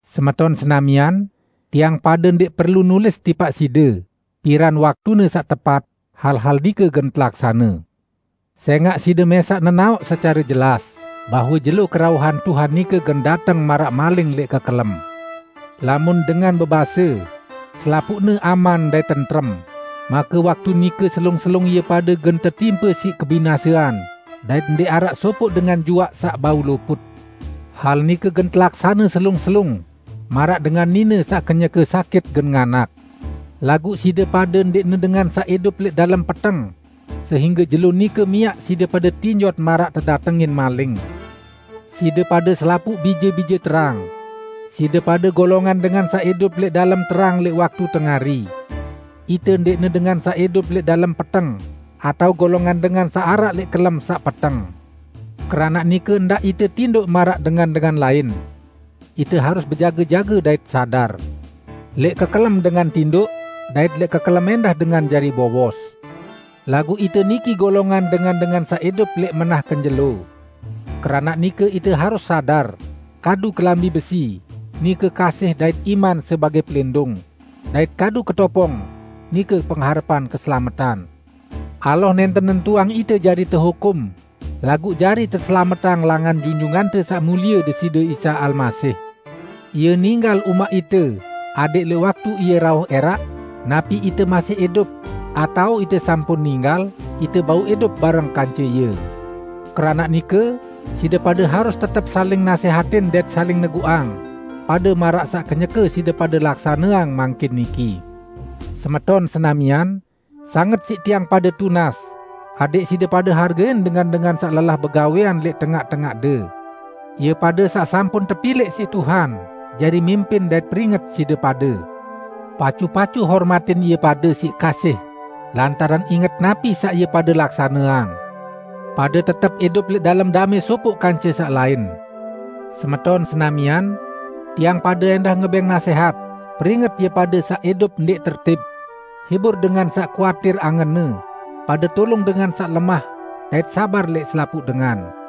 Semeton senamian, tiang pade ndẽq perlu nulis tipaq side piran waktune saq tepat hal-hal nike gen telaksane. Sẽngaq side mẽsaq nenaoq secare jelas bahwe jelo kerauhan Tuhan nike gen dateng maraq maling lẽq kekelem. Lamun dengan bebase, "Selapuqne aman dait tentrem," make waktu nike selung-selung ie pade gen tetimpe siq kebinasean, dait ndẽq araq sopoq dengan juaq saq bau luput. Hal nike gen telaksane selung-selung maraq dengan nine saq kenyeke sakit gen nganak. Laguq side pade ndẽqne dengan saq idup lẽq dalem peteng, sehingge jelo nike miaq side pade tinjot maraq tedatengin maling. Side pade selapuq bije-bije terang; side pade golongan dengan saq idup lẽq dalem terang lẽq waktu tengari. Ite ndẽqne dengan saq idup lẽq dalem peteng, atao golongan dengan saq araq lẽq kelem saq peteng. Keranaq nike ndaq ite tindoq maraq dengan-dengan lain. Ite harus bejage-jage dait sadar. Lẽq kekelem dengan tindoq, dait lẽq kekelem ẽndah dengan jari bowos. Laguq ite niki golongan dengan-dengan saq idup lẽq menah kenjelo; keranaq nike ite harus sadar, kadu kelambi besi, nike kasih dait iman sebagẽ pelindung, dait kadu ketopong, nike pengharepan keselametan. Allah nẽnten nentuang ite jari tehukum, laguq jari teselametang langan Junjungante Saq Mulie Deside Isa Almasih. Ie ninggal umaq ite adẽq lẽq waktu Ie rauh ẽraq -- napi ite masih idup, atao ite sampun ninggal -- ite bau idup bareng kance Ie. Keranaq nike, side pade harus tetep saling nasẽhatin dait saling neguqang, pade maraq saq kenyeke side pade laksaneang mangkin niki. Semeton senamian, sanget siq tiang pade tunas adẽq side pade hargein dengan-dengan saq lelah begawẽan lẽq tengaq-tengaqde; ie pade saq sampun tepilẽq siq Tuhan jari mimpin dait peringet side pade. Pacu-pacu hormatin ie pade siq kasih lantaran inget napi saq ie pade laksaneang. Pade tetep idup lẽq dalem damẽ sopoq kance saq lain. Semeton senamian, tiang pade ẽndah ngebẽng nasẽhat, peringet ie pade saq idup ndẽq tertib; hibur dengan saq kuatir angenne; pade tulung dengan saq lemah dait sabar lẽq selapuq dengan.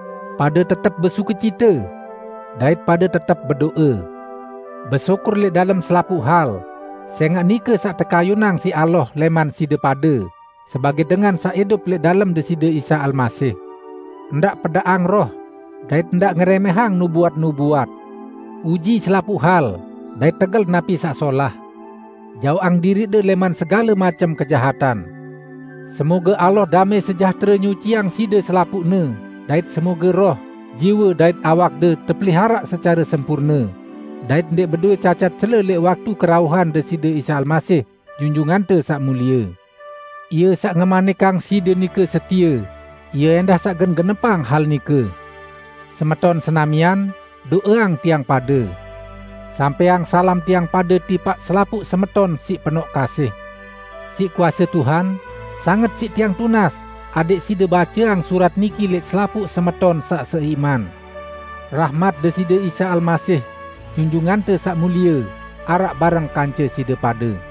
Pade tetep besukecite. Dait pade tetep bedo'e. Besyukur lẽq dalem selapuq hal, sẽngaq nike saq tekayunang siq Allah lẽman side pade sebagẽ dengan saq idup lẽq dalem Deside Isa Almasih. Ndaq pedaqang Roh, dait ndaq ngerẽmẽhang nubuat-nubuat. Uji selapuq hal dait tegel napi saq solah. Jaoqang diriqde lẽman segale macem kejahatan. Semoge Allah damẽ sejahtere nyuciang side selapuqne dait semoge roh, jiwe dait awakde tepeliharaq secare sempurne dait ndẽq bedowẽ cacat cele lẽq waktu kerauhan Deside Isa Almasih, Junjungante Saq Mulie. Ie saq ngemanikang side nike setie, Ie ẽndah saq gen genepang hal nike. Semeton senamian, do'eang tiang pade! Sampẽang salam tiang pade tipaq selapuq semeton siq penoq kasih. Siq kuase Tuhan, sanget siq tiang tunas adẽq side baceang surat niki lẽq selapuq semeton saq seiman. Rahmat Deside Isa Almasih, Junjungante Saq Mulie, araq bareng kance side pade.